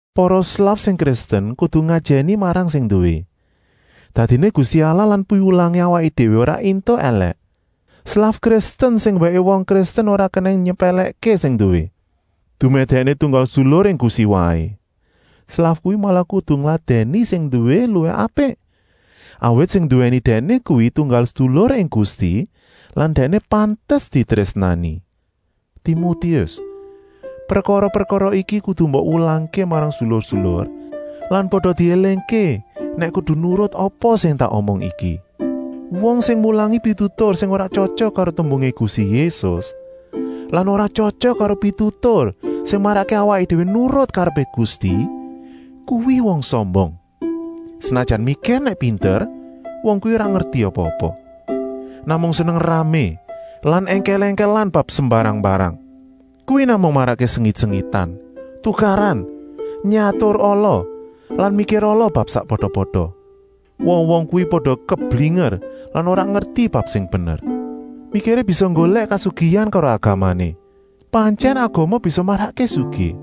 Para slaf sing Kristen kudu ngajèni marang sing nduwé, dadiné Gusti Allah lan piwulangé awaké déwé ora éntuk èlèk. Slaf Kristen sing wèké wong Kristen ora kenèng nyepèlèkké sing nduwé, dumèh dèkné tunggal sedulur ing Gusti waé. Slaf kuwi malah kudu ngladèni sing nduwé luwih apik, awit sing nduwèni dèkné kuwi tunggal sedulur ing Gusti lan dèkné pantes ditrésnani. Timotius, prekara-prekara iki kudu mbok wulangké marang sedulur-sedulur lan pada diélingké nèk kudu nurut apa sing tak omong iki. Wong sing mulangi pitutur sing ora tyotyok karo tembungé Gusti Yésus lan ora tyotyok karo pitutur sing marakké awaké déwé nurut karepé Gusti, kuwi wong sombong. Senajan mikir nèk pinter, wong kuwi ora ngerti apa-apa. Namung seneng ramé lan èngkèl-èngkèlan bab sembarang-mbarang. Kuwi namung marakké sengit-sengitan, tukaran, nyatur ala lan mikir ala bab sakpada-pada. Wong-wong kuwi pada keblinger lan ora ngerti bab sing bener. Mikiré bisa nggolèk kasugihan karo agamané. Pantyèn agama bisa marakké sugih,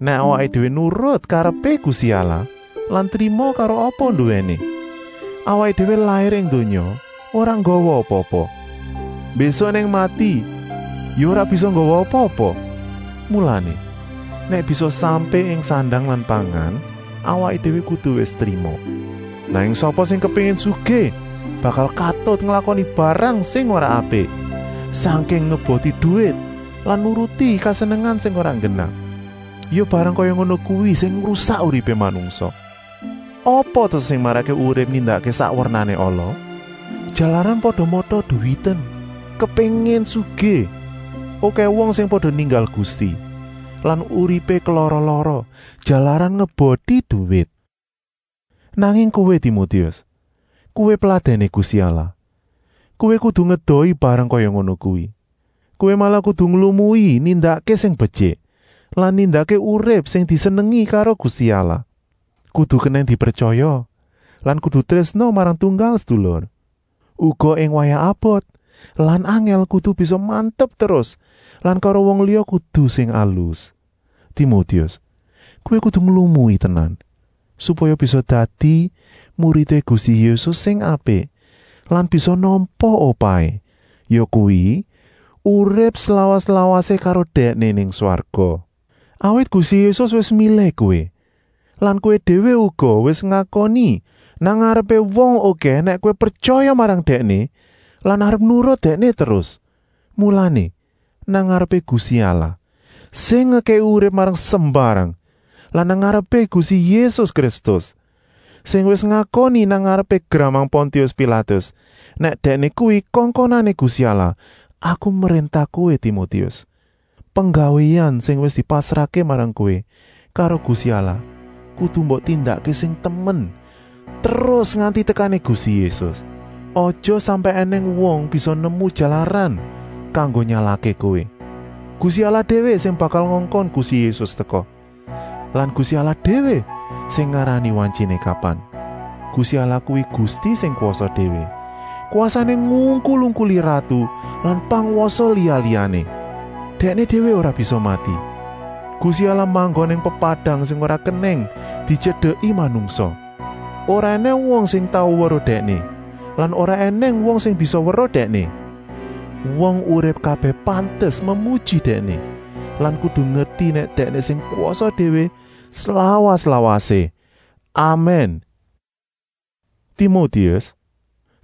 nèk awaké déwé nurut karepé Gusti Allah lan trima karo apa nduwéné. Awaké déwé lair ing donya ora nggawa apa-apa, mbésuk nèk mati ya ora bisa nggawa apa-apa. Mulané, nèk bisa sampé ing sandang lan pangan awaké déwé kudu wis trima. Nanging sapa sing kepéngin sugih bakal katut nglakoni barang sing ora apik, sangking ngeboti duwit lan nuruti kesenengan sing ora nggenah. Ya barang kaya ngono kuwi sing ngrusak uripé manungsa. Apa ta sing marakké wong urip nindakké sak wernané ala? Jalaran pada mata-duwiten, kepéngin sugih. Okèh wong sing pada ninggal Gusti lan uripé kelara-lara, jalaran ngeboti duwit. Nanging kowé Timotius, kowé peladèné Gusti Allah, kowé kudu ngedohi barang kaya ngono kuwi. Kowé malah kudu nglumui nindakké sing betyik lan nindakké urip sing disenengi karo Gusti Allah. Kudu kenèng dipretyaya lan kudu trésna marang tunggal sedulur. Uga ing wayah abot lan angèl kudu bisa mantep terus lan karo wong liya kudu sing alus. Timotius, kowé kudu nglumui tenan, supaya bisa dadi muridé Gusti Yésus sing apik lan bisa nampa upahé, yakuwi, urip slawas-lawasé karo Dèkné nang swarga. Awit Gusti Yésus wis milih kowé lan kowé déwé uga wis ngakoni nang ngarepé wong okèh nèk kowé pretyaya marang Dèkné lan arep nurut Dèkné terus. Mulané, nang ngarepé Gusti Allah, sing ngekèki urip marang sembarang lan nang ngarepé Gusti Yésus Kristus, sing wis ngakoni nang ngarepé gramang Pontius Pilatus nèk Dèkné kuwi kongkonané Gusti Allah, aku mréntah kowé, Timotius: penggawéan sing wis dipasrahké marang kowé karo Gusti Allah kudu mbok tindakké sing temen terus nganti tekané Gusti Yésus. Aja sampèk ènèng wong bisa nemu jalaran kanggo nyalahké kowé. Gusti Allah déwé sing bakal ngongkon Gusti Yésus teka lan Gusti Allah déwé sing ngarani wantyiné kapan. Gusti Allah kuwi Gusti sing kwasa déwé, kwasané ngungkul-ungkuli ratu lan pangwasa liya-liyané. Dèkné déwé ora bisa mati. Gusti Allah manggon nang pepadang sing ora kenèng dityedeki manungsa. Ora ènèng wong sing tau weruh Dèkné lan ora ènèng wong sing bisa weruh Dèkné. Wong urip kabèh pantes memuji Dèkné lan kudu ngerti nèk Dèkné sing kwasa déwé slawas-lawasé. Amèn. Timotius,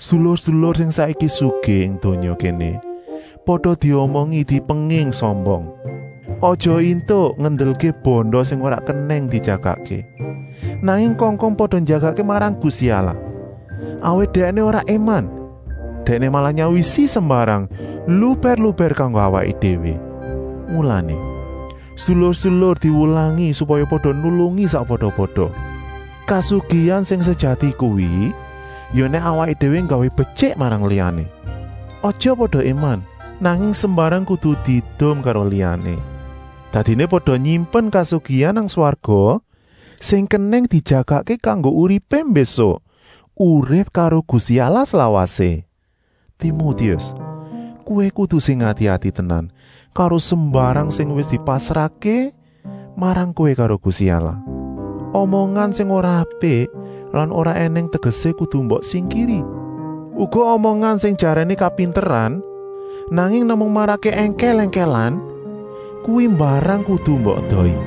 sedulur-sedulur sing saiki sugih ing donya kéné pada diomongi dipenging sombong. Aja éntuk ngendelké banda sing ora kenèng dijagakké, nanging kongkon pada njagakké marang Gusti Allah. Awit Dèkné ora éman, Dèkné malah nyawisi sembarang lubèr-lubèr kanggo awaké déwé. Mulané, sedulur-sedulur diwulangi supaya pada nulungi sakpada-pada. Kasugihan sing sejati kuwi ya nèk awaké déwé nggawé betyik marang liyané. Aja pada éman, nanging sembarang kudu diedum karo liyané. Dadiné pada nyimpen kasugihan nang swarga sing kenèng dijagakké kanggo uripé mbésuk, urip karo Gusti Allah slawasé. Timotius, kowé kudu sing ati-ati tenan karo sembarang sing wis dipasrahké marang kowé karo Gusti Allah. Omongan sing ora apik lan ora ènèng tegesé kudu mbok singkiri. Uga omongan sing jaréné kapinteran, nanging namung marakké èngkèl-èngkèlan. Kuwi mbarang kudu mbok edohi.